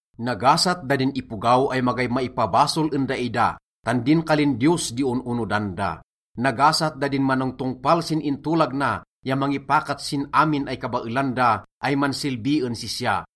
Nagasat da din ipogaw ay magay maipabasol en daida, tan din kalin Diyos di on-onodan da. Nagasat da din manongtongpal sin intolag na ya mangipakat sin amin ay kabaelan da ay mansilbi en sisya.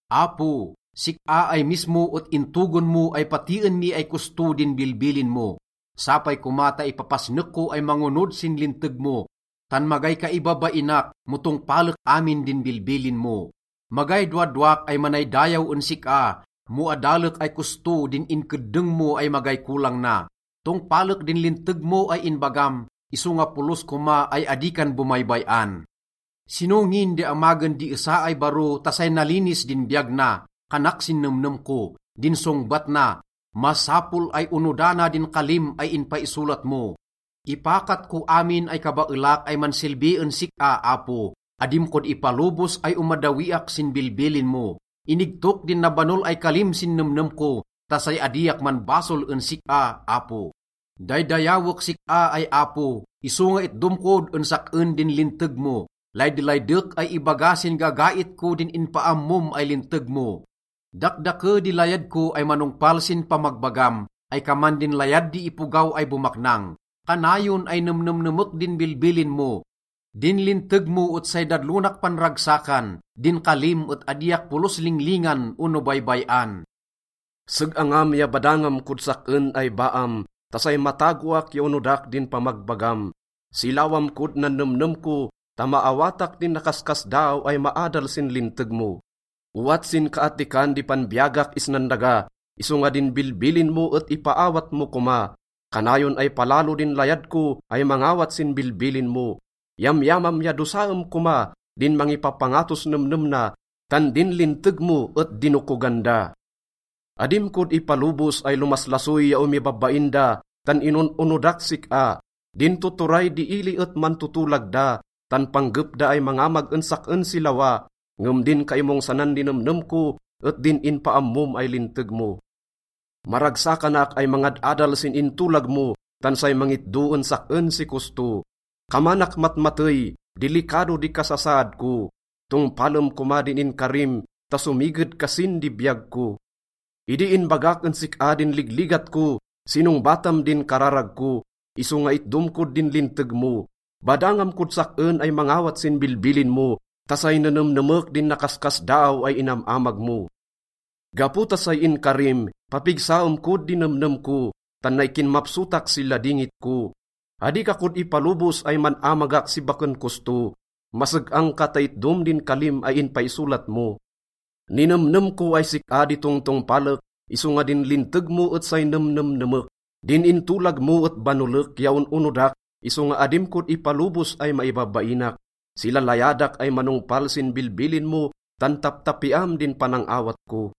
Apo, sik-a ay mismo et intogon mo ay patien mi ay kosto din bilbilin mo. Sapay koma ta ipapasnek ko ay mangonod sin linteg mo, tan magay kaibabainak mo tongpalek amin din bilbilin mo. Magay dowadowak ay manaydayaw en sik-a mo adalek ay kosto din inkeddeng mo ay magay kolang na. Tongpalek din linteg mo ay inbagam, isonga polos koma ay adi kan bomaybay-an. “Sino ngin di amagen di esa ay baro ta say nalinis din biyag na?” kanak sin nemnem ko. Din songbat na, “Masapol ay onodana din kalim ay inpaisolat mo.” Ipakat ko amin ay kabaelak ay mansilbi en sik-a, Apo, adim kod ipalobos ay omaddawiak sin bilbilin mo. Inigtok din nabanol ay kalim sin nemnem ko ta say adiak manbasol en sik-a, Apo. Daydayawek sik-a ay Apo, isonga itdom kod en sak-en din linteg mo. Laydelaydek ay ibaga sin gagait ko din inpaammom ay linteg mo. Dakdake di layad ko ay manongpal sin pamagbagam ay kaman din layad di ipogaw ay bomaknang. Kanayon ay nemnemnemek din bilbilin mo. Din linteg mo et say dadlonak panragsakan, din kalim et adiak polos linglingan ono baybay-an. Seg-angam ya badangam kod sak-en ay baam ta say matagoak ya onodak din pamagbagam. Silawam kod nan nemnem ko ta maawatak din nakaskasdaaw ay maadal sin linteg mo. Owat sinkaattikan di panbiyagak isnan daga isonga din bilbilin mo et ipaawat mo koma. Kanayon ay palalo din layad ko ay mangawat sin bilbilin mo. Yamyamam ya dosaem koma din mangipapangatos nemnem na, tan din linteg mo et dinokogan da. Adim kod ipalobos ay lomaslasoy ya omibabain da, tan inon-onodak sik-a. Din tuturay di ili et mantotolag da, tan panggep da ay mangamag en sak-en si lawa, ngem din kaimongsanan di nemnem ko et din inpaammom ay linteg mo. Maragsakanak ay mangad-adal sin intolag mo, tan say mangitdo en sak-en si kosto. Kamanak matmatey, dilikado di kasasaad ko, tongpalem koma din inkarim ta somiged kasin di biyag ko. Idi inbagak en sik-a din ligligat ko, sinongbatam din kararag ko, isonga itdom kod din linteg mo. Badangam kod sak-en ay mangawat sin bilbilin mo ta say nenemnemek din nakaskasdaaw ay inam-amag mo. Gapo ta say inkarim, papigsaem kod di nemnem ko, tan nay kinmapsotak si ladingit ko. Adi ka kod ipalobos ay man-amagak si baken kosto, maseg-ang ka ta itdom din kalim ay inpaisolat mo. Ninemnem ko ay sik-a di tongtongpalek, isonga din linteg mo et say nemnemnemek. Din intolag mo et banolek ya on-onodak, isonga adim kod ipalobos ay maibabainak. Silalayadak ay manongpal sin bilbilin mo, tan taptapiam din panang-awat ko.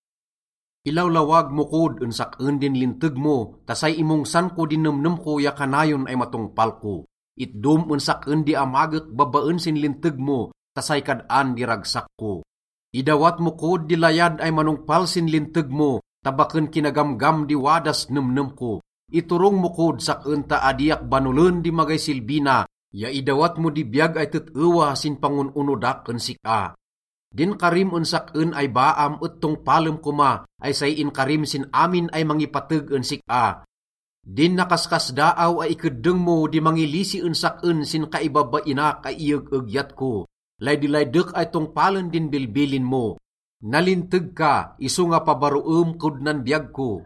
Ilawlawag mo kod en sak-en din linteg mo ta say imongsan ko din nemnem ko ya kanayon ay matongpal ko. Itdom en sak-en di amagek babaen sin linteg mo, tan say kad-an di ragsak ko. Idawat mo kod di layad ay manongpal sin linteg mo ta baken kinagamgam di wadas nemnem ko. Iturong mo kod sak-en ta adiak banolen di magay silbi na ya idawat mo di biyag ay tet-ewa sin pangon-onodak en sik-a. Din karim en sak-en ay baam et tongpalem koma, ay say inkarim sin amin ay mangipateg en sik-a. Din nakaskasdaaw ay ikeddeng mo di mangilisi en sak-en sin kaibabainak ay ieg-egyat ko. Laydelaydek ay tongpalen din bilbilin mo. Nalinteg ka isonga pabaroem kod nan biyag ko.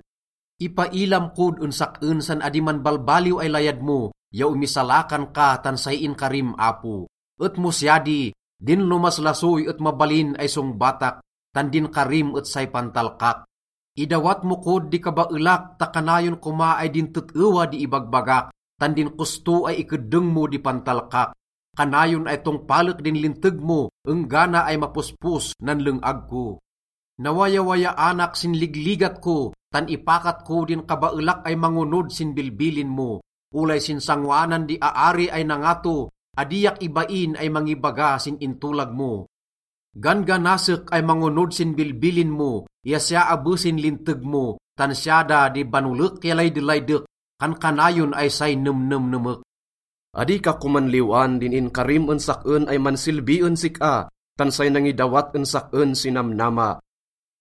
Ipailam kod en sak-en san adi manbalbaliw ay layad mo ya omisalakan ka tan say inkarim, Apo, Et mo siya di, din lomaslasoy et mabalin ay songbatak, tan din karim et say pantalkak. Idawat mo kod di kabaelak ta kanayon koma ay din tet-ewa di ibagbagak, tan din kosto ay ikeddeng mo di pantalkak. Kanayon ay tongpalek din linteg mo enggana ay mapospos nan leng-ag ko. Nawayawayaanak sin ligligat ko, tan ipakat ko din kabaelak ay mangonod sin bilbilin mo. Olay sin sangoanan di aari ay nangato, adiak ibain ay mangibaga sin intolag mo. Gan-ganasek ay mangonod sin bilbilin mo ya siya abe sin linteg mo, tan siya da di banolek ya laydelaydek, kankanayon ay say nemnemnemek. Adi ka koman liw-an din inkarim en sak-en ay mansilbi en sik-a, tan say nangidawat en sak-en si namnama.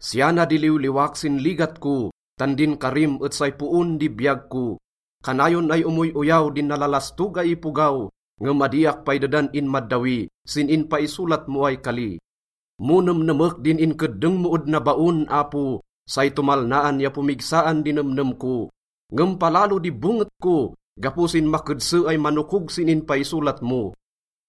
Siya na di liwliwak sin ligat ko, tan din karim et say poon di biyag ko. Kanayon ay omoy-oyaw din nalalastog ay ipogaw, ngem adiak pay dedan inmaddawi sin inpaisolat mo ay kali. Mo nemnemek din inkeddeng mo ed nabaon, Apo, say tomalnaan ya pomigsaan di nemnem ko. Ngem palalo di bonget ko gapo sin makedse ay manokog sin inpaisolat mo.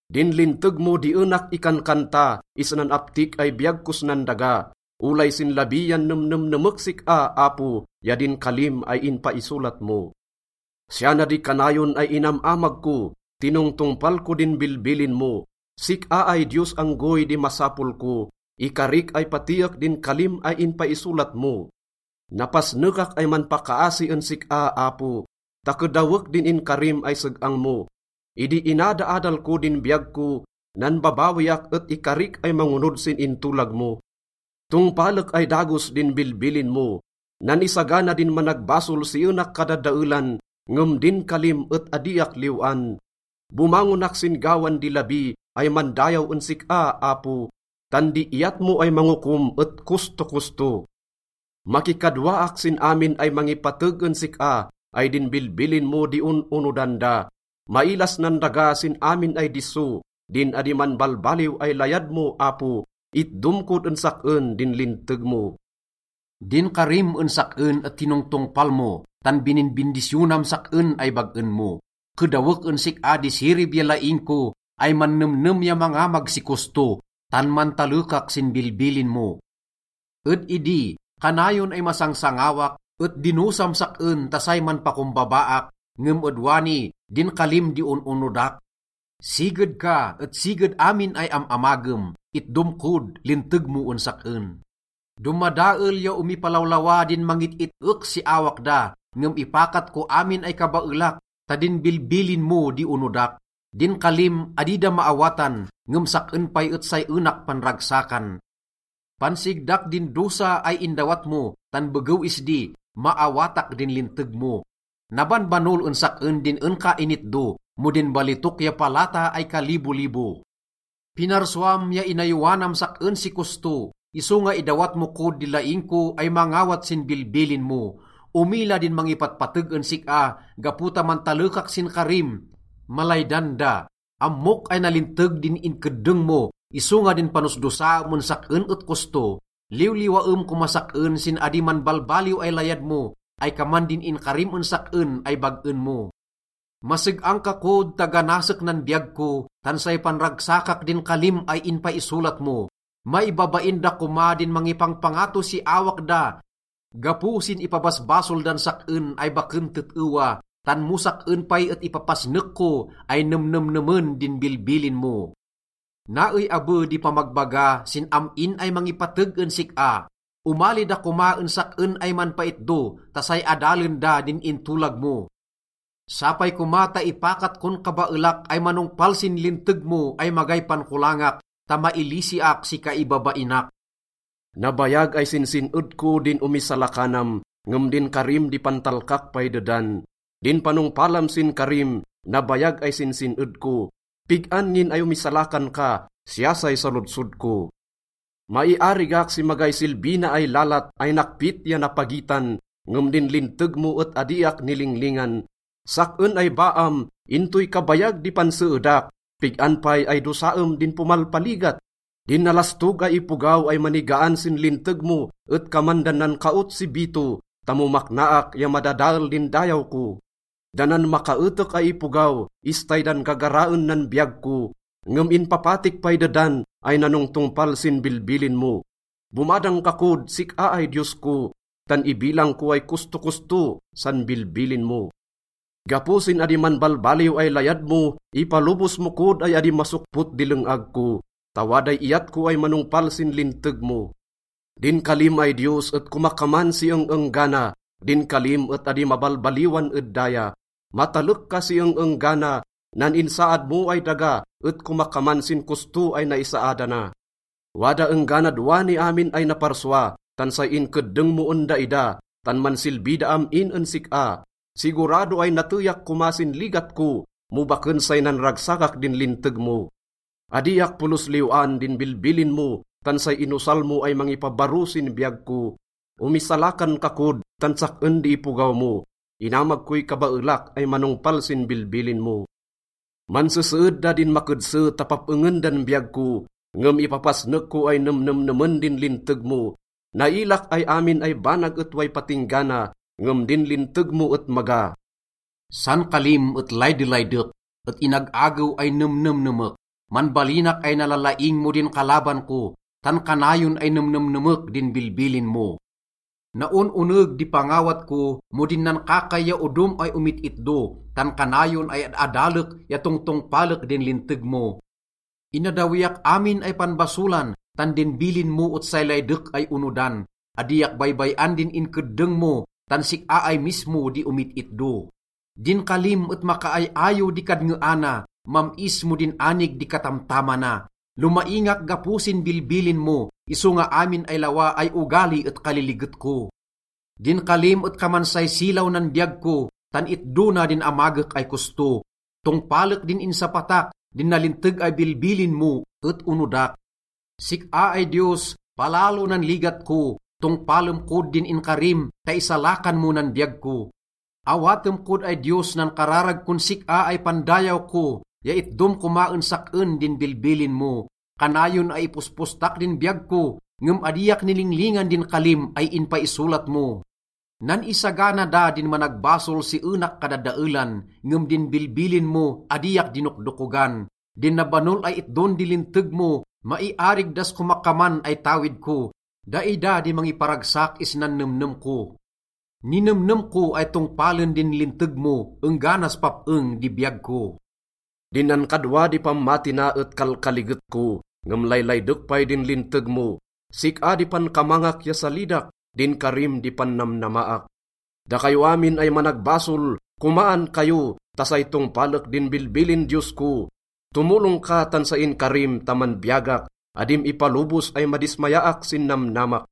Din linteg mo di enak ikankanta isnan aptik ay biyag kos nan daga. Olay sin labi yan nemnemnemek sik-a, Apo, ya din kalim ay inpaisolat mo. Siya na di kanayon ay inam-amag ko, tinongtongpal ko din bilbilin mo. Sik-a ay Diyos anggoy di masapol ko, ikarik ay patiek din kalim ay inpaisolat mo. Napasnekak ay manpakaasi en sik-a, Apo, ta kedawek din inkarim ay seg-ang mo. Idi inadaadal ko din biyag ko, nanbabawiak et ikarik ay mangonod sin intolag mo. Tongpalek ay dagos din bilbilin mo. Nan-isagana din managbasol si enak kadadaelan, ngem din kalim et adiak liw-an. Bomangonak sin gawan di labi ay mandayaw en sik-a, Apo, tan di iyat mo ay mangokom et kostokosto. Makikadwaak sin amin ay mangipateg en sik-a ay din bilbilin mo di on-onodan da. Mailas nan daga sin amin ay disso din adi manbalbaliw ay layad mo, Apo. Itdom kod en sak-en din linteg mo. Din karim en sak-en et tinongtongpal mo, tan bininbindisyonam sak-en ay bag-en mo. Kedawek en sik-a di sirib ya laing ko ay mannemnem ya mangamag si kosto, tan mantalekak sin bilbilin mo. Ed idi, kanayon ay masangsangawak, et dinosam sak-en ta say manpakombabaak, ngem ed wani, din kalim di on-onodak. Siged ka et siged amin ay am-amagem, itdom kod linteg mo en sak-en. Domadael ya omipalawlawa din mangit-it-ek si awak da, ngem ipakat ko amin ay kabaelak ta din bilbilin mo di onodak. Din kalim, adi da maawatan, ngem sak-en pay et say enak panragsakan. Pansigdak din dosa ay indawat mo, tan begew isdi, maawatak din linteg mo. Nabanbanol en sak-en din en ka initdo, mo din balitok ya palata ay kalibolibo. Pinarsuam ya inayowanam sak-en si kosto, isonga idawat mo kod di laing ko ay mangawat sin bilbilin mo. Omila din mangipatpateg en sik-a. Gapo ta mantalekak sin karim, malaydan da. Ammok ay nalinteg din inkeddeng mo, isonga din panosdosaam en sak-en et kosto. Liwliwaem komas sak-en sin adi manbalbaliw ay layad mo ay kaman din inkarim en sak-en ay bag-en mo. Maseg-ang ka kod ta ganasek nan biyag ko, tan say panragsakak din kalim ay inpaisolat mo. Maibabain da koma din mangipangpangato si awak da gapo sin ipabasbasol dan sak-en ay baken tet-ewa, tan mo sak-en pay et ipapasnek ko ay nemnemnemen din bilbilin mo. Naey abe di pamagbaga sin am-in ay mangipateg en sik-a: omali da koma en sak-en ay manpaitdo ta say adalen da din intolag mo. Sapay koma ta ipakat kon kabaelak ay manongpal sin linteg mo ay magay pankolangak ta mailisiak si kaibabainak. Nabayag ay sinsin-ed ko din omisalakanam, ngem din karim di pantalkak pay dedan. Din panongpalam sin karim, nabayag ay sinsin-ed ko. “Pig-an ngin ay omisalakan ka?” siya say salodsod ko. Maiarigak si magay silbi na ay lalat ay nakpit ya napagitan, ngem din linteg mo et adiak nilinglingan. Sak-en ay baam, intoy kabayag di panseedak? Pig-an pay ay dosaem din pomalpaligat? Din nalastog ay ipogaw ay manigaan sin linteg mo et kaman dan nankaot si bito ta mo maknaak ya madadael din dayaw ko. Da nan makaetek ay ipogaw, istay dan gagaraen nan biyag ko, ngem inpapatik pay dedan ay nanongtongpal sin bilbilin mo. Bomadang ka kod, sik-a ay Diyos ko, tan ibilang ko ay kostokosto san bilbilin mo. Gapo sin adi manbalbaliw ay layad mo, ipalobos mo kod ay adi masokpot di leng-ag ko ta waday iyat ko ay manongpal sin linteg mo. Din kalim ay Diyos et komakaman si eng-enggana, din kalim et adi mabalbaliwan ed daya. Matalek ka si eng-enggana. Nan insaad mo ay daga et komakaman sin kosto ay naisaadana. Wada engganad wani amin ay naparsua, tan say inkeddeng mo en daida, tan mansilbi da am-in en sik-a. Sigurado ay nateyak koma sin ligat ko mo baken say nanragsakak din linteg mo. Adiak polos liw-an din bilbilin mo, tan say inosal mo ay mangipabaro sin biyag ko. Omisalakan ka kod, tan sak-en di ipogaw mo, inamag koy kabaelak ay manongpal sin bilbilin mo. Manseseed da din makedse ta pap-engen dan biyag ko, ngem ipapasnek ko ay nemnemnemen din linteg mo. Nailak ay amin ay banag et way patingga na, ngem din linteg mo et maga. San kalim et laydelaydek, et inag-agew ay nemnemnemek. Manbalinak ay nalalaing mo din kalaban ko, tan kanayon ay nemnemnemek din bilbilin mo. Naon-oneg di pangawat ko mo din nankakay ya odom ay omit-itdo, tan kanayon ay ad-adalek ya tongtongpalek din linteg mo. Inaddawiak amin ay panbasolan tan din bilin mo et say laydek ay onodan. Adiak baybay-an din inkeddeng mo, tan sik-a ay mismo di omit-itdo. Din kalim et makaay-ayo di kadngeana, mam-is mo din anig di katamtamana. Lomaingak gapo sin bilbilin mo, isonga amin ay lawa ay ogali et kaliliget ko. Din kalim et kaman say silaw nan biyag ko, tan itdo na din amagek ay kosto. Tongpalek din insapatak, din nalinteg ay bilbilin mo et onodak. Sik-a ay Diyos, palalo nan ligat ko, tongpalem kod din inkarim ta isalakan mo nan biyag ko. Awatem kod ay Diyos nan kararag kon sik-a ay pandayaw ko ya itdom koma en sak-en din bilbilin mo. Kanayon ay ipospostak din biyag ko, ngem adiak nilinglingan din kalim ay inpaisolat mo. Nan-isagana da din managbasol si enak kadadaelan, ngem din bilbilin mo, adiak dinokdokogan. Din nabanol ay itdon di linteg mo, maiarig das komakaman ay tawid ko, daida di mangiparagsak isnan nemnem ko. Ninemnem ko ay tongpalen din linteg mo engganas pap-eng di biyag ko. Din nankadwa di pammati na et kalkaliget ko, ngem laylaydek pay din linteg mo. Sik-a di pankamangak ya salidak, din karim di pannamnamaak. Dakayo amin ay managbasol, komaan kayo, ta say tongpalek din bilbilin Diyos ko. Tomolong ka tan say inkarim ta manbiyagak, adim ipalobos ay madismayaak sin namnamak.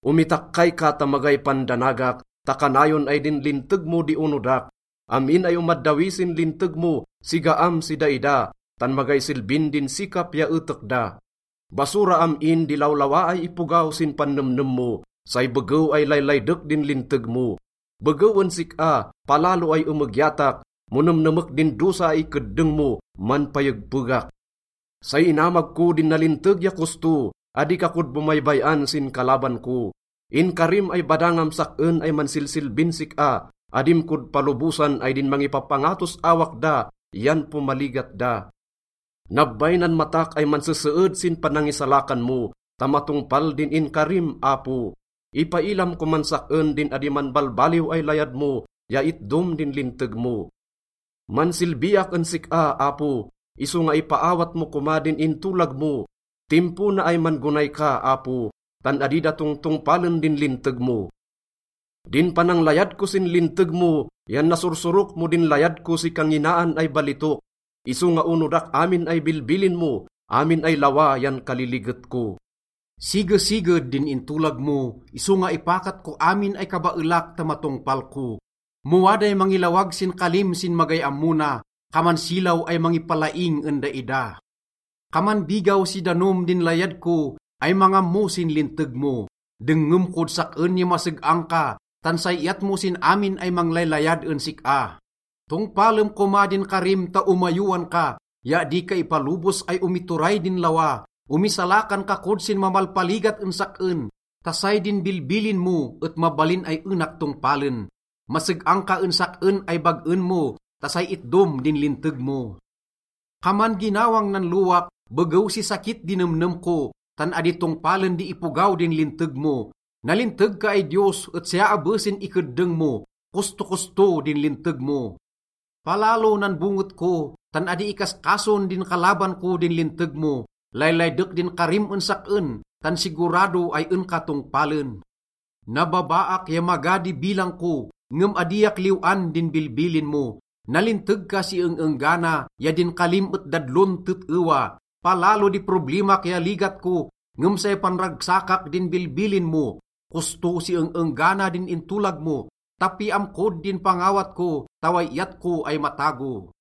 Omitakkay ka ta magay pandanagak, ta kanayon ay din linteg mo di onodak. Am-in ay omaddawi sin linteg mo, sigaam si daida, tan magay silbin din sikap ya etek da. Basura am-in di lawlawa ay ipogaw sin pannemnem mo, say begew ay laylaydek din linteg mo. Begew en sik-a, palalo ay emegyatak, mo nemnemek din dosa ay ikeddeng mo, manpayegpegak. Say inamag ko din nalinteg ya kosto, adi ka kod bomaybay-an sin kalaban ko. Inkarim ay badangam sak-en ay mansilsilbin sik-a, adim kod palobosan ay din mangipapangatos awak da yan pomaligat da. Nabbay nan matak ay manseseed sin panangisalakan mo ta matongpal din inkarim, Apo. Ipailam koman sak-en din adi manbalbaliw ay layad mo ya itdom din linteg mo. Mansilbiak en sik-a, Apo, isonga ipaawat mo koma din intolag mo. Timpo na ay man-gonay ka, Apo, tan adi da tongtongpalen din linteg mo. Din pananglayad ko sin linteg mo yan nasursurok mo din layad ko si kanginaan ay balitok. Isonga onodak amin ay bilbilin mo, amin ay lawa yan kaliliget ko. Sigesiged din intolag mo, isonga ipakat ko amin ay kabaelak ta matongpal ko. Mo waday mangilawag sin kalim sin magay ammo na, kaman silaw ay mangipalaing en daida. Kaman bigaw si danom din layad ko ay mangammo sin linteg mo. Dengngem kod sak-en ya maseg-ang ka, tan say iyat mo sin amin ay manglaylayad en sik-a. Tongpalem koma din karim ta omayowan ka, ya adi ka ipalobos ay omituray din lawa. Omisalakan ka kod sin mamalpaligat en sak-en ta say din bilbilin mo et mabalin ay enak tongpalen. Maseg-ang ka en sak-en ay bag-en mo ta say itdom din linteg mo. Kaman ginawang nan lowak begew si sakit di nemnem ko, tan adi tongpalen di ipogaw din linteg mo. Nalinteg ka ay Diyos et siya abe sin ikeddeng mo. Kostokosto din linteg mo. Palalo nan bonget ko, tan adi ikaskason din kalaban ko din linteg mo. Laylaydek din karim en sak-en, tan sigurado ay en ka tongpalen. Nababaak ya maga di bilang ko, ngem adiak liw-an din bilbilin mo. Nalinteg ka si eng-enggana, ya din kalim et dadlon tet-ewa. Palalo di problemak ya ligat ko, ngem say panragsakak din bilbilin mo. Kosto si eng-enggana din intolag mo, tapiam kod din pangawat ko ta way iyat ko ay matago.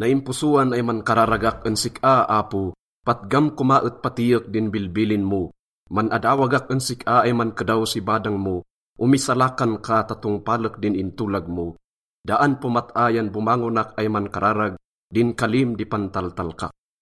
Naimposoan ay mankararagak en sik-a, Apo, patgam koma et patiek din bilbilin mo. Man-adawagak en sik-a ay mankedaw si badang mo, omisalakan ka ta tongpalek din intolag mo. Daan pomat-a yan bomangonak ay mankararag, din kalim di pantaltalkak.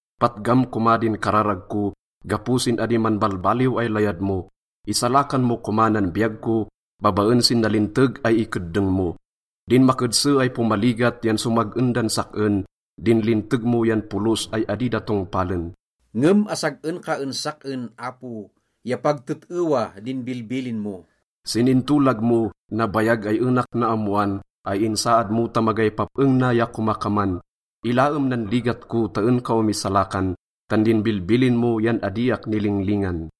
Patgam koma din kararag ko gapo sin adi manbalbaliw ay layad mo. Isalakan mo koma nan biyag ko babaen sin nalinteg ay ikeddeng mo. Din makedse ay pomaligat yan somag-en dan sak-en, din linteg mo yan polos ay adi da tongpalen. Ngem asag-en ka en sak-en, Apo, ya pag tet-ewa din bilbilin mo. Sin intolag mo, nabayag ay enak naammoan ay insaad mo ta magay pap-eng na ya komakaman. Ilaem nan ligat ko ta en ka omisalakan, tan din bilbilin mo yan adiak nilinglingan.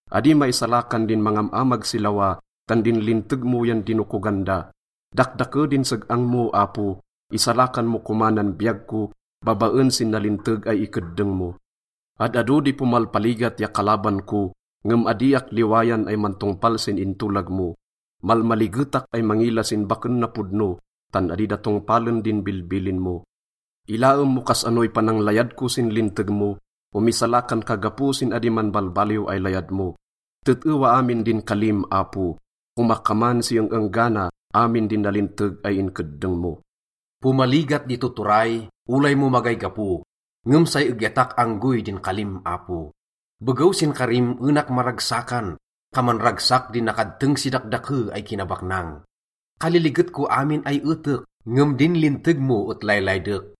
Adi maisalakan din mangam-amag si lawa, tan din linteg mo yan dinokogan da. Dakdake din seg-ang mo, Apo, isalakan mo koma nan biyag ko babaen sin nalinteg ay ikeddeng mo. Ad-ado di pomalpaligat ya kalaban ko, ngem adiak liwayan ay mantongpal sin intolag mo. Malmaligetak ay mangila sin baken napodno, tan adi da tongpalen din bilbilin mo. Ilaem mo kas-anoy pananglayad ko sin linteg mo, omisalakan ka gapo sin adi manbalbaliw ay layad mo. Tet-ewa amin din kalim, Apo, komakaman si eng-enggana amin din nalinteg ay inkeddeng mo. Pomaligat di tuturay olay mo magay gapo, ngem say egyatak anggoy din kalim, Apo. Begew sin karim enak maragsakan, kaman ragsak di nakadteng si dakdake ay kinabaknang. Kaliliget ko amin ay etek, ngem din linteg mo et laylaydek.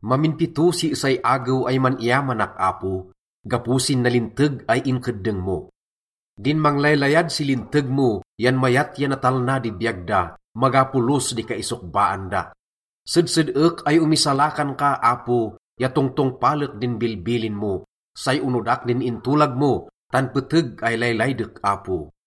Mamin pito si esay agew ay man-iyamanak, Apo, gapo sin nalinteg ay inkeddeng mo. Din manglaylayad si linteg mo yan mayat ya natalna di biyag da, maga polos di kaisokbaan da. Sedsed-ek ay omisalakan ka, Apo, ya tongtongpalek din bilbilin mo. Say onodak din intolag mo, tan peteg ay laylaydek, Apo.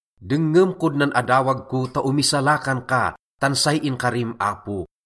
Dengngem kod nan adawag ko ta omisalakan ka, tan say inkarim, Apo.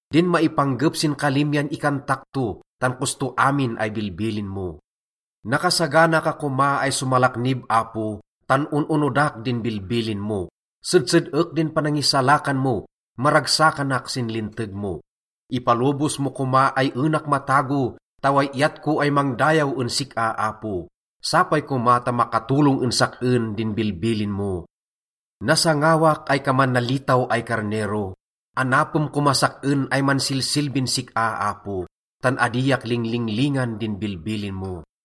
Din maipanggep sin kalim yan ikantak to, tan kosto amin ay bilbilin mo. Nakasagana ka koma ay somalaknib, Apo, tan on-onodak din bilbilin mo. Sedsed-ek din panangisalakan mo, maragsakanak sin linteg mo. Ipalobos mo koma ay enak matago ta way iyat ko ay mangdayaw en sik-a, Apo. Sapay koma ta makatolong en sak-en din bilbilin mo. Nasangawak ay kaman nalitaw ay karnero, anapem komas sak-en ay mansilsilbin sik-a, Apo, tan adiak linglinglingan din bilbilin mo.